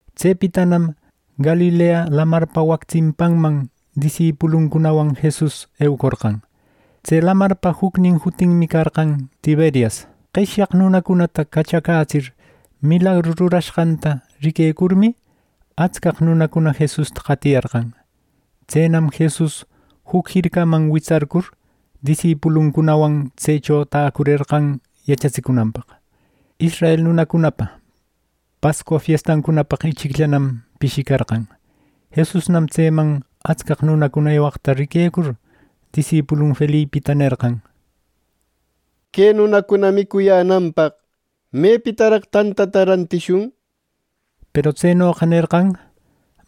Tsepitanam Galilea Lamarpa wac tsimpanman disipuluncunawan Jesus eucorqan. Tse lamarpa jucnin jutinmi carqan Tiberias. Qeshyaq nunacunata cachacätsir milagru rurashqanta riquecurmi, atscaq nunacuna Jesusta qatiyarqan. Tsenam Jesus juc jircaman witsarcur, disipuluncunawan tsecho täcurerqan yachatsicunanpaq. Israel nunacunapa Pascua fiestancunapaq ichicllanam pishicarqan. Jesusnam tseman atscaq nunacuna ewaqta riquecur, disipulun Felipita nerqan: —Que nunacuna micuyänanpaq ¿mepitaraq tantata rantishun? —nir. Peru tsenoqa nerqan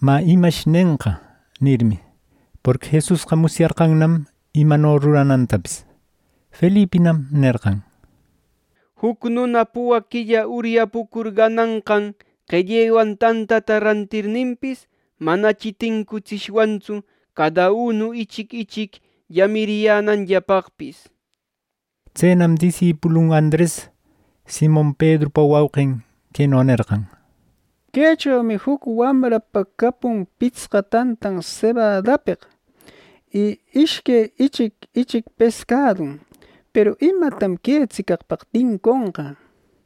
“Mä, ¿Imash nenqa?” nirmi, porqui Jesusqa musyarqannam imano ruranantapis. Felipinam nerqan: —Juc nuna puwaq quilla uryapucur gananqan qellewan tantata rantirninpis, manachi tincutsishwantsu cada unu ichic ichic llamiriyänanllapaqpis —nir. Tsenam disipulun Andres, Simon Pedrupa wauqin, queno nerqan: —Quechomi juc wamrapa capun pitsqa tantan sebadapeq y ishque ichic ichic pescadun; ¿Peru imatam que tsicaqpaq tinconqa! —nir.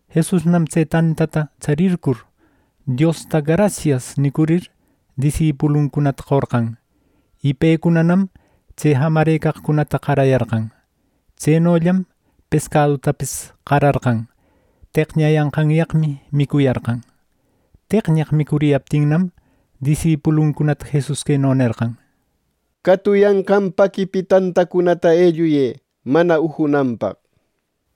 Jesusnam tse tantata tsarircur, Diosta “Grasias” nicurir, disipuluncunata qorqan. Y pecunanam tse jamecaqcunata qarayarqan. Tsenollam pescadutapis qararqan. Teqñayanqanyaqmi micuyarqan. Tecñaq micuriyaptinnam, disipuluncunata Jesus queno nerqan: —Catuyanqan paquipi tantacunata elluyë mana ujunanpaq —nishpa.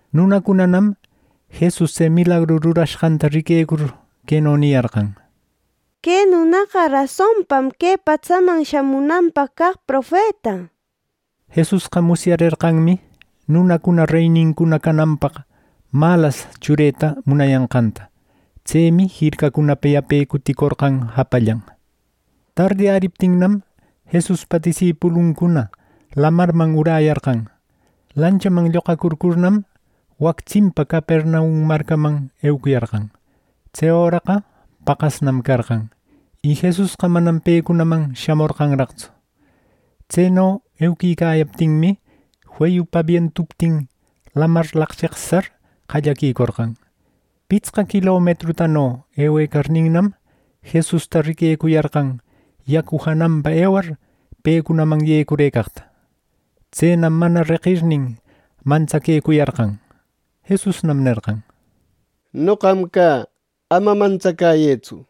Nunacunanam Jesus tse milagru rurashqanta riquecur, queno niyarqan: —¡Que nunaqa rasonpam que patsaman shamunanpaq caq profeta! —nir. Jesusqa musyarerqanmi nunacuna reynincuna cananpaq malas chureta munayanqanta. Tsemi jircacunapa yape cuticorqan japallan. Tardiyäriptinnam, Jesuspa disipuluncuna lamarman uräyarqan. Lanchaman lloqacurcurnam, wac tsimpa Capernaum marcaman eucuyarqan. Tse öraqa paqasnam carqan, y Jesusqa manam pecunaman shamorqanraqtsu. Tseno euquicayaptinmi, feyupa bientuptin, lamar laqcheqsar qallaquicorqan. Pitsqa quilometrutano ewecarninnam, Jesusta riquecuyarqan yacu jananpa ewar pecunaman yecurëcaqta. Tsenam mana reqirnin, mantsaquecuyarqan. Jesusnam nerqan: —¡Noqam cä. Ama mantsacäyëtsu!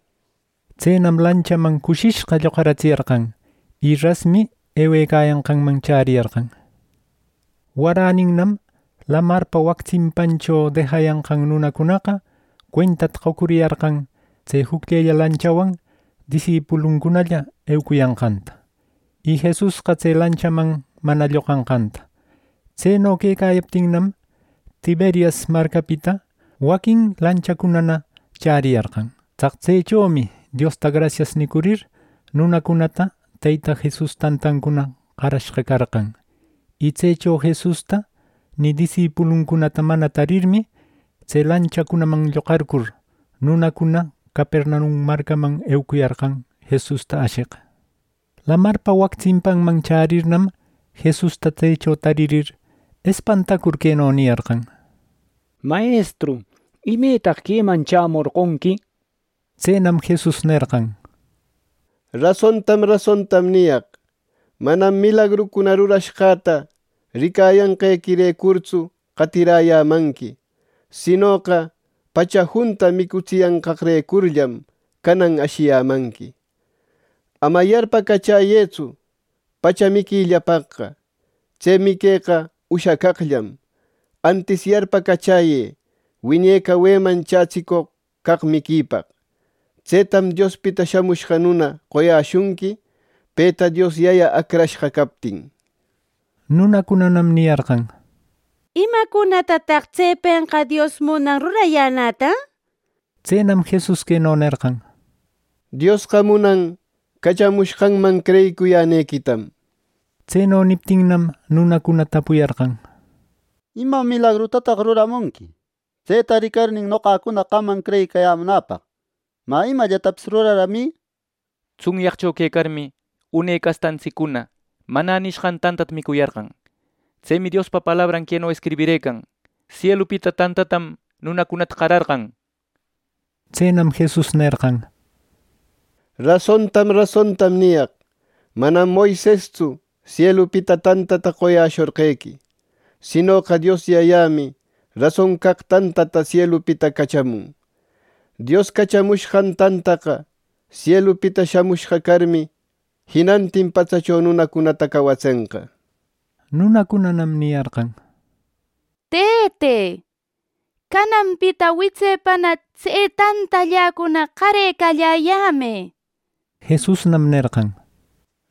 Tsenam lanchaman cushishqa lloqaratsiyarqan; y rasmi ewecayanqanman chäriyarqan. Waräninnam, lamarpa wac tsimpancho dejayanqan nunacunaqa cuentata qocuriyarqan tse jucllella lanchawan disipuluncunalla eucuyanqanta, y Jesusqa tse lanchaman mana lloqanqanta. Tseno quecayaptinnam, Tiberias marcapita waquin lanchacunana chäriyarqan. Tsaq tsechomi Diosta grasias nicurir, nunacunata Teyta Jesus tantancuna qarashqa carqan. Y tsecho Jesusta ni disipuluncunata mana tarirmi, tse lanchacunaman lloqarcur, nunacuna Capernaum marcaman eucuyarqan Jesusta asheq. Lamarpa wac tsimpanman chärirnam, Jesusta tsecho taririr, espantacur queno niyarqan: —Mayestru ¿Imetaq queman chämorqonqui? —nir. Tsenam Jesus nerqan: —Rasontam rasontam niyaq. Manam milagrucuna rurashqäta ricayanqequirecurtsu qatiräyämanqui; sinoqa pacha junta micutsiyanqaqrecurllam, canan ashiyämanqui. Ama yarpacachäyëtsu pacha miquillapaqqa. Tse miqueqa ushacaqllam. Antis, yarpacachäyë wiñe caweman chätsicoq caq miquipaq. Tsetam Diospita Shamushqa Nuna qoyäshunqui, peta Dios Yaya acrashqa captin —nir. Nunacunanam niyarqan: —¿Imacunatataq tsepenqa Dios munan rurayänäta? —nir. Tsenam Jesus queno nerqan: —Diosqa munan cachamushqanman creyicuyänequitam —nir. Tseno niptinnam, nunacuna tapuyarqan: —¿Ima milagrutataq ruraramunqui tseta ricarnin noqacuna qamman creyicayämunäpaq? ¿Mä, Imallatapis ruraramï? Tsunyaqcho quecarmi, une castantsiccuna ‘Manä’ nishqan tantata micuyarqan. Tsemi Diospa palabran queno escribirëcan: ‘Sielupita tantatam nunacunata qararqan’ nir. Tsenam Jesus nerqan: —Rasontam rasontam niyaq: Manam Moisestsu sielupita tantata qoyäshorqequi, sinoqa Dios Yayämi rason caq tantataqa sielupita cachamun. Dios cachamushqan tantaqa sielupita shamushqa carmi, jinantin patsacho nunacunata cawatsenqa —nir. Nunacunaman niyarqan: —Tëte, cananpita witsepana tse tantalläcuna qarecalläyämë —nishpa. Jesusnam nerqan: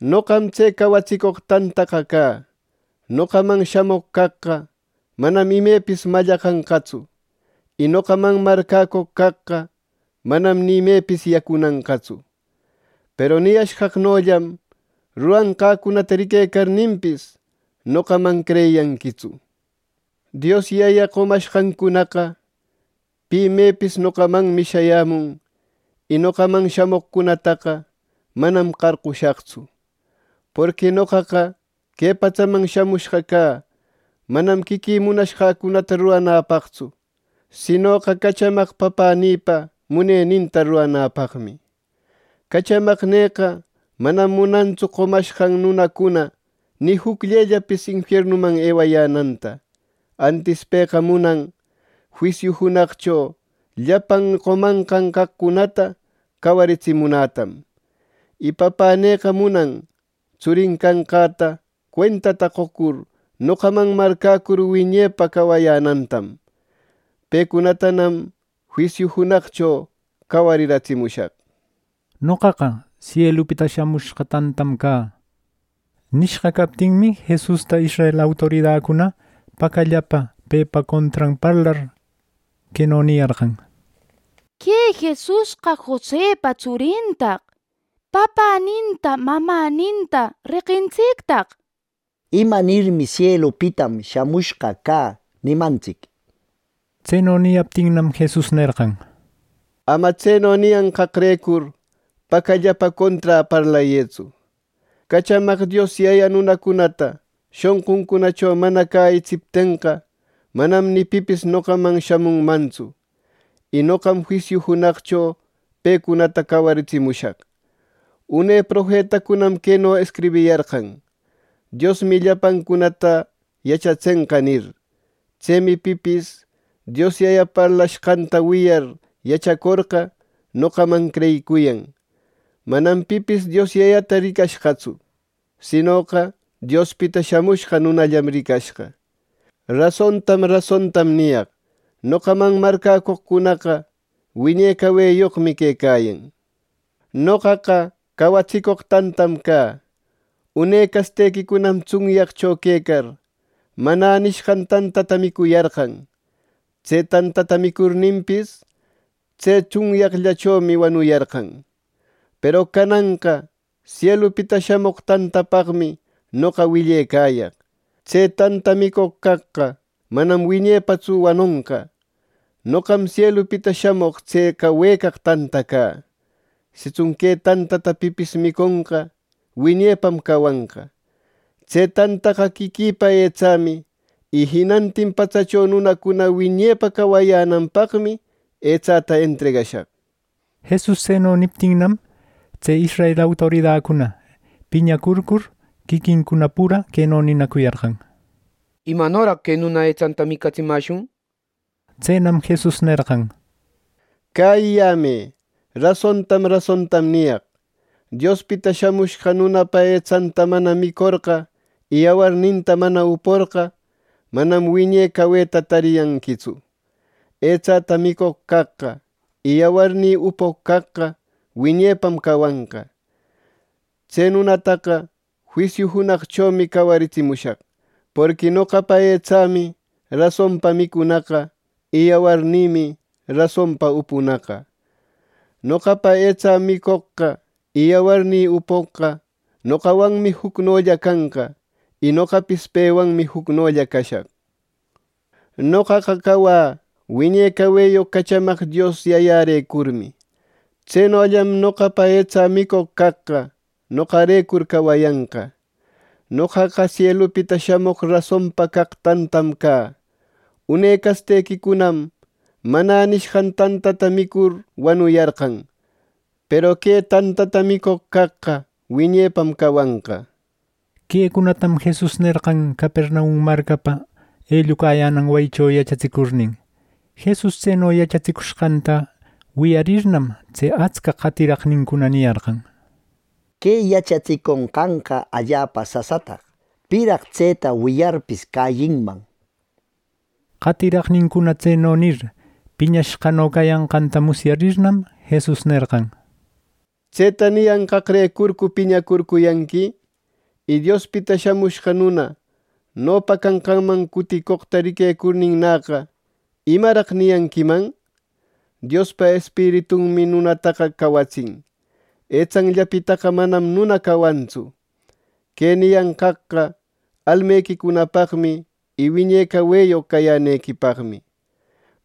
—Noqam tse cawatsicoq tantaqa cä. Noqaman shamoq caqqa manam imepis mallaqanqatsu, y noqaman marcäcoq caqqa manam ni imepis yacunanqatsu. Peru niyashqaqnollam rurashqäcunata riquecarninpis, noqaman creyiyanquitsu. Dios Yaya qomashqancunaqa pi mepis noqamanmi shayämun y noqaman shamoqcunataqa manam qarqushaqtsu. Porqui noqaqa que patsaman shamushqa cä manam quiquï munashqäcunata ruranäpaqtsu, sinoqa cachamaq Papänïpa muneninta ruranäpaqmi. Cachamaqnïqa manam munantsu qomashqan nunacuna ni jucllellapis infiernuman ewayänanta. Antis pëqa munan juisiu junaqcho llapan qomanqan caqcunata cawaritsimunätam. Y Papänïqa munan tsurin canqäta cuentata qocur, noqaman marcäcur, wiñepa cawayänantam. Pecunatanam juisiu junaqcho cawariratsimushaq —nir. “Noqaqa sielupita shamushqa tantam cä” nishqa, captinmi, Jesusta israel autoridacuna, pacallapa pepa contran parlar, queno niyarqan: —¡Que Jesusqa Josepa tsurintaq! ¡Papäninta mamäninta reqintsictaq! ¿Imanirmi ‘Sielupitam shamushqa cä’ nimantsic! —nir. Tseno niyaptinnam, Jesus nerqan: —Ama tseno niyanqaqrecur pacallapa conträ parlayëtsu. Cachamaq Dios Yaya nunacunata shonquncunacho mana cäyitsiptenqa, manam ni pipis noqaman shamunmantsu; y noqam juisiu junaqcho pecunata cawaritsimushaq. Une profetacunam queno escribiyarqan: ‘Diosmi llapancunata yachatsenqa’ nir. Tsemi pipis Dios Yaya parlashqanta wiyar yachacorqa, noqaman creyicuyan. Manam pipis Dios Yayata ricashqatsu, sinoqa Diospita Shamushqa Nunallam ricashqa. Rasontam rasontam niyaq. Noqaman marcäcoqcunaqa wiñe cawayoqmi quecayan. Noqaqa cawatsicoq tantam cä. Une castequicunam tsunyaqcho quecar, ‘Manä’ nishqan tantata micuyarqan. Tse tanta micurninpis, tse tsunyaqllachomi wanuyarqan. Peru cananqa sielupita shamoq tantapaqmi noqa willecayaq. Tse tanta micoq caqqa manam wiñepatsu wanonqa. Noqam sielupita shamoq tse cawecaq tanta cä. Sitsun que tantata pipis miconqa, wiñepam cawanqa. Tse tantaqa quiquïpa etsämi. Y jinantin patsacho nunacuna wiñepa cawayänanpaqmi etsäta entregashaq. Jesus tseno niptinnam, tse israel autoridacuna piñacurcur, quiquincuna pura queno ninacuyarqan: —¿Imanoraq que nuna etsanta micutsimäshun! —nir. Tsenam Jesus nerqan: —Cäyiyämë. Rasontam rasontam niyaq. Diospita Shamushqa Nunapa etsanta mana micorqa y yawarninta mana uporqa, manam wiñe caweta tariyanquitsu. Etsä micoq caqqa y yawarnï upoq caqqa wiñepam cawanqa. Tse nunataqa juisiu junaqchomi cawaritsimushaq. Porqui noqapa etsämi rasonpa micunaqa, y yawarnïmi rasonpa upunaqa. Noqapa etsä micoqqa y yawarnï upoqqa, noqawanmi jucnolla canqa y noqapis pewanmi jucnolla cashaq. Noqaqa cawä wiñe caweyoq cachamaq Dios Yayarecurmi, tsenollam noqapa etsä micoq caqqa noqarecur cawayanqa. Noqaqa sielupita shamoq rasonpa caq tantam cä. Une castequicunam ‘Manä’ nishqan tantata micur wanuyarqan, peru que tantata micoq caqqa wiñepam cawanqa —nir. Quecunatam Jesus nerqan Capernaum marcapa ellucayänan wayincho yachatsicurnin. Jesus tseno yachatsicushqanta wiyarirnam, tse atscaq qatiraqnincuna niyarqan: —Que yachatsiconqanqa allapa sasataq. ¿Piraq tseta wiyarpis cäyinman! —nishpa. Qatiraqnincuna tseno nir piñashqano cayanqanta musyarirnam, Jesus nerqan: —¿Tseta niyanqaqrecurcu piñacurcuyanqui? Y Diospita Shamushqa Nuna nopa canqanman cuticoqta ricarninnäqa, ¿imaraq niyanquiman? Diospa Espiritunmi nunataqa cawatsin. Etsanllapitaqa manam nuna cawantsu. Que nicayanqaqqa almequicunapaqmi y wiñe caweyoq cayänequipaqmi.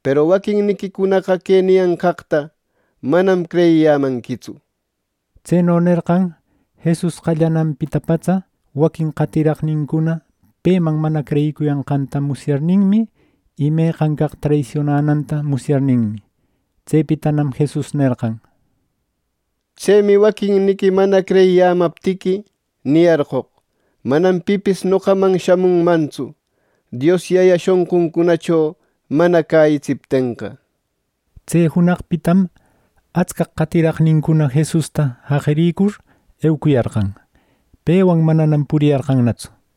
Peru waquinniquicunaqa que niyanqaqta manam creyiyämanquitsu —nir. Tseno nerqan Jesus qallananpita patsa waquin qatiraqnincuna peman mana creyicuyanqanta musyarninmi, y meqan caq traisionananta musyarninmi. Tsepitanam Jesus nerqan: —Tsemi waquinniqui mana creyiyämaptiqui, niyarqoq, ‘Manam pipis noqaman shamunmantsu, Dios Yaya shonquncunacho mana cäyitsiptenqa’ —nir. Tse junaqpitam atscaq qatiraqnincuna Jesusta jaqiricur eucuyarqan. Pewan mananam puriyarqannatsu.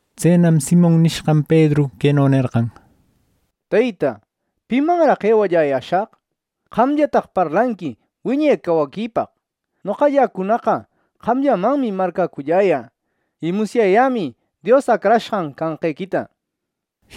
Tsenam Simon nishqan Pedru queno nerqan: —Teyta, ¿pimanraq ewallayäshaq? ¡Qamllataq parlanqui wiñe cawaquipaq! Noqalläcunaqa qamllamanmi marcäculläyä. Y musyayämi Dios Acrashqan canqequita —nishpa.